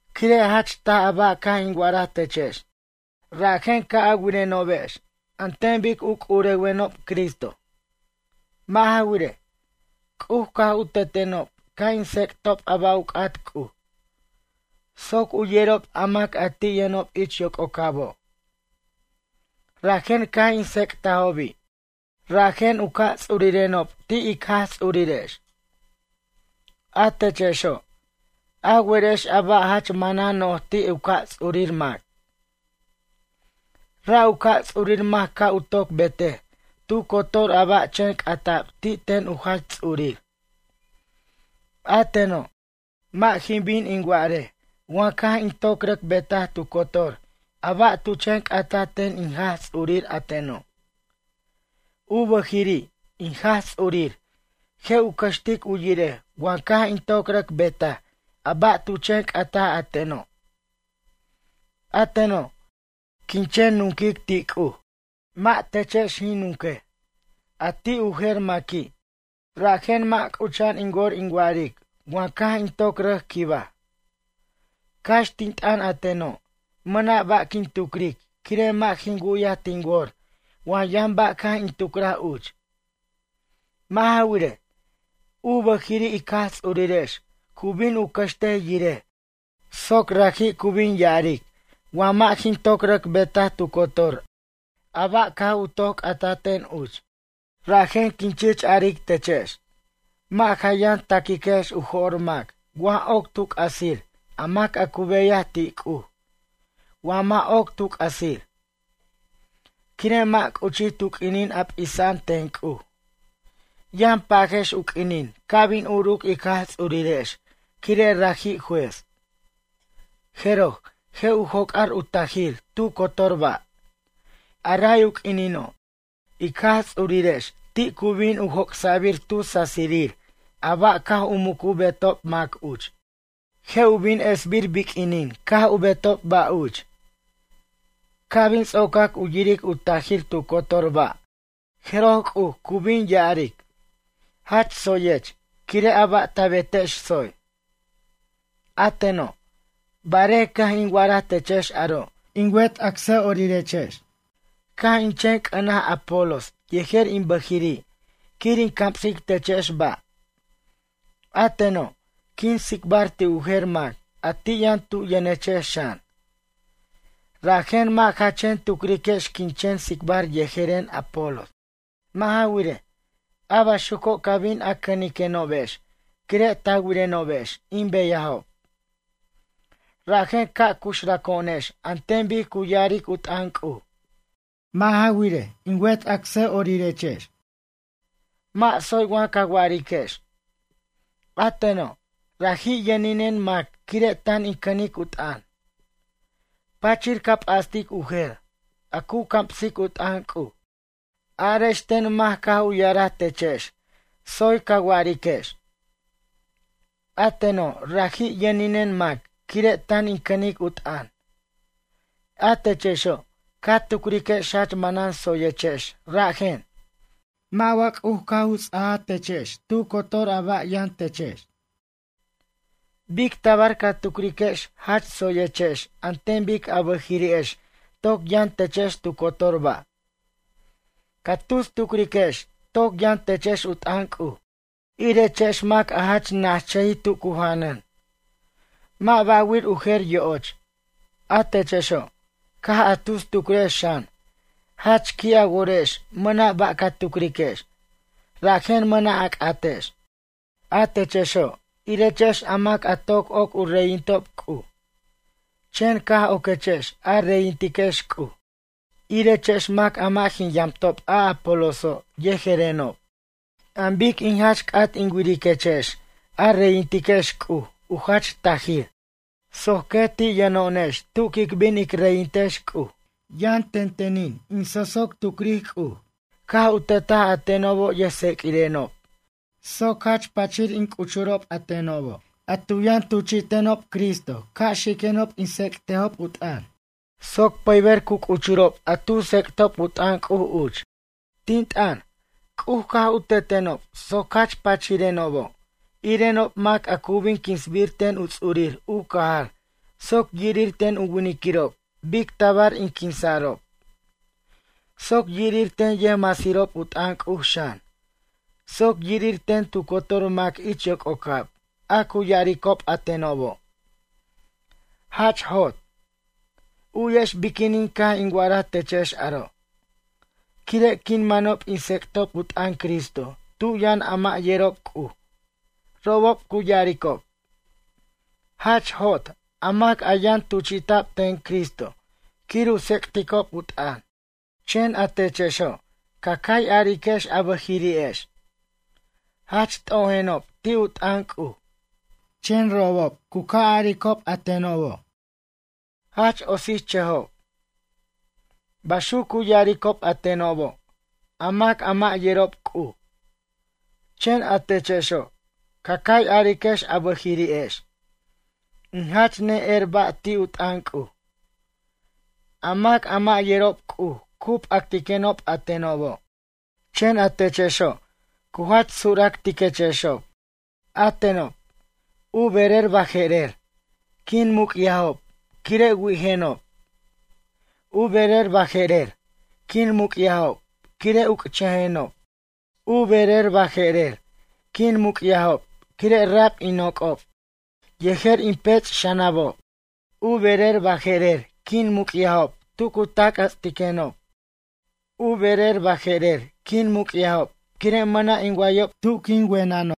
Quire' jach taj a ba' caj in wa'araj techex, rajen ca' a wirenobex an ten bic u c'urewenob Cristo. Mʌ' ja wirej, C'uj caj u tetenob ca' in tsec'tob a ba' u c'at C'uj, soc u yerob a mac a ti' yʌnob ich yococabo'. Rajen caj in tsec'tajobi', rajen u ca' ts'urirenob ti' ic Jaj Ts'urirex. A techexo', a werex a ba' jach manan noj ti' u ca' ts'urir mac. Ra' u ca' ts'urir mac ca' u toc betej tu cotor a ba' chen c'ata'b ti' ten u jach ts'urir. A teno', mʌ' jin bin in wa'arej wa caj in toc rʌc betaj tu cotor a ba' tu chen c'ata ten in Jaj Ts'urir a teno'. U bʌjiri' in Jaj Ts'urir je' u cʌxtic u yirej wa caj in toc rʌc betaj a ba' tu chen c'ata a teno'. A teno', quin chen nunquic ti' C'uj, mʌ' techex jin nunquej, mʌ' ti' u jer maqui'. Rajen mʌ' c'ucha'an in wor in wa'aric wa caj in toc rʌc quibaj. Cax tin t'ʌn a teno', mʌna' ba' quin tucric quire' mʌ' jin wu'yaj tin wor wa yʌn ba' caj in tucraj uch. Mʌ' ja wirej, u bʌjiri' ic Jaj Ts'urirex cu bin u cʌxtej yirej soc raji' cu bin ya'aric wa mʌ' jin toc rʌc betaj tu cotor a ba' caj u c'ata ten uch. Rajen quin chich aric techex, mʌ' ja yʌn taquiquex u jo'r mac wa oc tu c'asir a mac a cu beyaj ti' C'uj, wa mʌ' oc tu c'asir. Quire' mʌ' c'uchij tu q'uinin a p'isa'an ten C'uj. Yʌn pajex u q'uinin ca' bin uruc ic Jaj Ts'urirex quire' raji' juez. Jeroj, je' u joc'ar u tajir tu cotor ba'. A ray u q'uinino', ic Jaj Ts'urirex ti' cu bin u joc'sa'bir tu sasirir a ba' caj u mucu betob mac uch. Je' u bin esbir biq'uinin caj u betob ba' uch. Ca' bin ts'ocac u yiric u tajir tu cotor ba', jeroj C'uj cu bin ya'aric: “Jach tsoyech, quire' a ba' ta betex tsoy.” A teno', barej caj in wa'araj techex aro' in wet acsa'orirex, caj in chen c'ʌnaj Apolos yejer in bʌjiri' quir in camsic techex ba'. A teno', quin tsicbar ti' u jer mac a ti' yʌn tu yʌnechex xan. Rajen mʌ' ja chen tucriquex quin chen tsicbar yejeren Apolos. Mʌ' ja wirej, a baxuco' ca bin a cʌniquenobex, quire' ta wirenobex in beyajob. Rajen ca' cuxraco'onex an ten bic cu ya'aric u t'ʌn C'uj. Mʌ' ja wirej, in wet acsa'orirex, mʌ' tsoy wa ca wa'ariquex: “A teno', raji' yʌninen mac quire' tan in cʌnic u t'ʌn.” Pachir ca p'astic u jer, a cu camsic u t'ʌn C'uj. Arex ten mac caj u ya'araj techex tsoy ca wa'ariquex: “A teno' raji' yʌninen mac quire' tan in cʌnic u t'ʌn?” A techexo', ca tucriquex jach manan tsoyechex rajen? Mʌ' wa C'uj caj u ts'aja techex tu cotor a ba' yʌn techex? Bic tabar ca tucriquex jach tsoyechex an ten bic a bʌjiri'ex toc yʌn techex tu cotor ba'? Ca tus tucriquechex toc yʌn techex u t'ʌn C'uj, irechex mac a jach nachʌji tu cu janʌn. Mʌ' ba'wir u jer yo'och. A techexo', caj a tus tucrex xan, jach qui' a worex mʌna' ba' ca tucriquex, rajen mʌna' a c'atex. A techexo', irechex a mac a toc oc u reyintob C'uj. Chen caj oquechex a reyintiquex C'uj, irechex mac a mʌ' jin yamtob a Apoloso', yejerenob. An bic in jach c'at in wiriquechex a reyintiquex C'uj u jach tajir soc quet ti' yʌno'onex tu quic bin ic reyintex C'uj. Yʌn tentenin in so'soc tucric C'uj caj u tetaj a tenobo' yʌjtseq'uirenob soc jach pachir in c'uchurob a tenobo' a tu yʌn tuchi'tenob Cristo ca' xiquenob in tsec'tajob u t'ʌn, soc pʌyber cu c'uchurob a tu tsec'tob u t'ʌn C'uj uch. Tin t'ʌn, C'uj caj u tetenob soc jach pachirenobo', irenob mac a cu bin quinsbir ten u ts'urir u cajar soc yirir ten u winiquirob bic tabar in quinsa'rob. Soc yirir ten yʌjmasirob u t'ʌn C'uj xan, soc yirir ten tu cotor mac ich yoc'ocab a cu ya'aricob a tenobo': “Jach jot.” U'yex biquinin caj in wa'araj techex aro'. Quire' quin manob in tsec'tob u t'ʌn Cristo tu' yʌn a mʌ' yerob C'uj, robob cu ya'aricob: “Jach jot a mac a yʌn tuchi'ta'b ten Cristo quir u tsec'ticob u t'ʌn.” Chen a techexo', ca cay ariquex a bʌjiri'ex: “Jach t'ojenob ti' u t'ʌn C'uj.” Chen robob u ca' aricob a tenob: “Jach otsichʌjob.” Baxuc cu ya'aricob a tenobo', a mac a mʌ' yerob C'uj. Chen a techexo', ca cay ariquex a bʌjiri'ex: “In jach ne'er ba' ti' u t'ʌn C'uj.” A mac a mʌ' yerob C'uj cu p'actiquenob a tenobo', chen a techexo', cu jach suractiquechexob. A tenob, u berer baje'rer, quin muc'yajob quire' wi'ijenob. U berer baje'rer, quin muc'yajob quire' uc'chʌjenob. U berer baje'rer, quin muc'yajob quire' rab in noc'ob yejer in pech' xʌnabob. U berer baje'rer quin muc'yajob tu cu tac'jʌts'tiquenob. U berer baje'rer quin muc'yajob quire' mʌna' in wayob tu quin wenenob.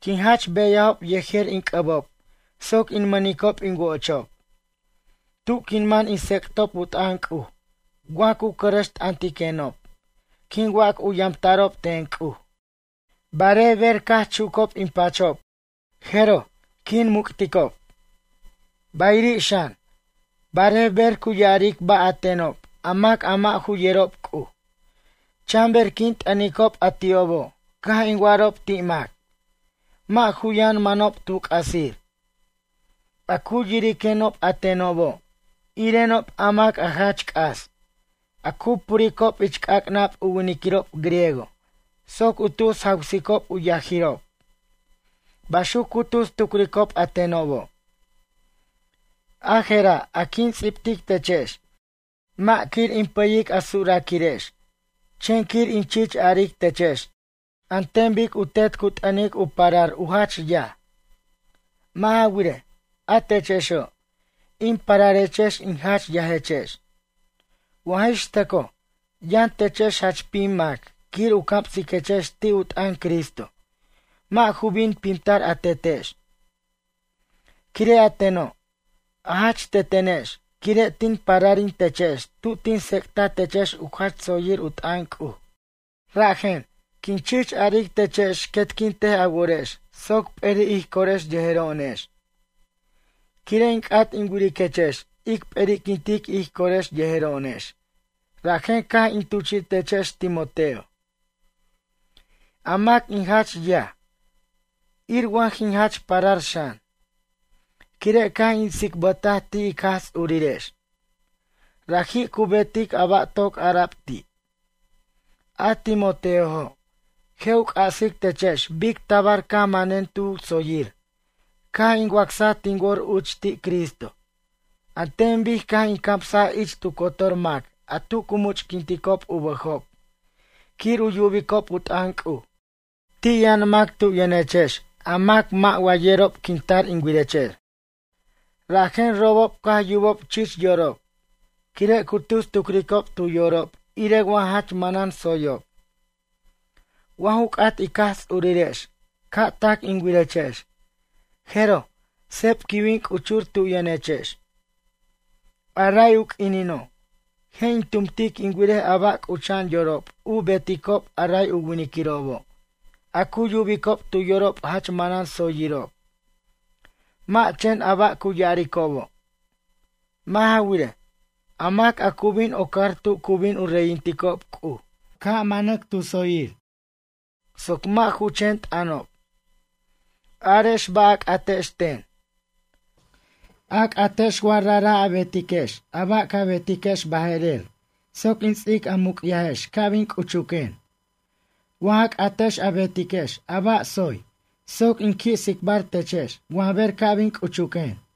Quin jach beyajob yejer in c'ʌbob soc in mʌnicob in wo'ochob. Tu' quin man in tsec'tob u t'ʌn C'uj, wa cu cʌrʌxt'ʌntiquenob, quin wac u yamta'rob ten C'uj. Barej ber caj chucob in pachob, jeroj, quin muc'ticob. Bayiri' xan, barej ber cu ya'aric ba' a tenob a mac a mʌ' ju yerob C'uj, chanber quin t'ʌnicob a ti'obo' caj in wa'arob ti' mac, mʌ' ju yʌn manob tu c'asir. A cu yiriquenob a tenobo', irenob a mac a jach c'as, a cu puricob ich c'ac'nab u winiquirob griego soc u tus jawsicob u yajirob. Baxuc cu tus tucricob a tenobo'. A jera' a quin ts'ibtic techex, mʌ' quir in pʌyic a suraquirex, chen quir in chich aric techex an ten bic u tet cu t'ʌnic u parar u jach yaj. Mʌ' ja wirej, a techexo', in pararechex in jach yajechex. Wa jix tʌcoj, yʌn techex jach pim mac quir u camsiquechex ti' u t'ʌn Cristo, mʌ' ju bin pimtar a tetex, quire' a teno', a jach tetenex quire' tin pararin techex tu tin tsec'ta techex u jach tsoyir u t'ʌn C'uj. Rajen, quin chich aric techex quetquintej a worex soc p'eri' ij corex yejero'onex. Quire' in c'at in wiriquechex ic p'eri'quintic ij corex yejero'onex, rajen caj in tuchi'techex Timoteo, a mac in jach yaj, ir wa jin jach parar xan, quire' caj in tsicbʌtaj ti' ic Jaj Ts'urirex. Raji' cu betic a ba' toc ara'b ti'. A Timoteojo', je' u c'asic techex bic tabar caj manen tu tsoyir, caj in wacsaj tin wor uch ti' Cristo, an ten bic caj in camsaj ich tu cotor mac a tu cu much'quinticob u bʌjob quir u yubicob u t'ʌn C'uj. Ti' yʌn mac tu' yʌnechex a mac mʌ' wa yerob quin tar in wirechex, rajen robob caj u yubob chich yorob, quire' cu tus tucricob tu yorob ire wa jach manan tsoyob. Wa ju c'at ic Jaj Ts'urirex ca' tac in wirechex, jeroj seb quin bin c'uchur tu yʌnechex. A ray u q'uinino', je' in tumtic in wirej a ba' c'ucha'an yorob u beticob a ray winiquirobo', a cu yubicob tu yorob jach manan tsoyirob, mʌ' chen a ba' cu ya'aricobo'. Mʌ' ja wirej, a mac a cu bin ocar tu cu bin u reyinticob C'uj, ca' manac tu tsoyir, soc mʌ' ju chen t'ʌnob. Arex ba' a c'atex ten. A c'atex wa rajra' a betex a ba' ca betiquex baje'rer soc in ts'ic a muc'yajex ca' bin c'uchuquen. Wa ja c'atex a betex a ba' tsoy soc in qui' tsicbar techex wa ber ca' bin c'uchuquen.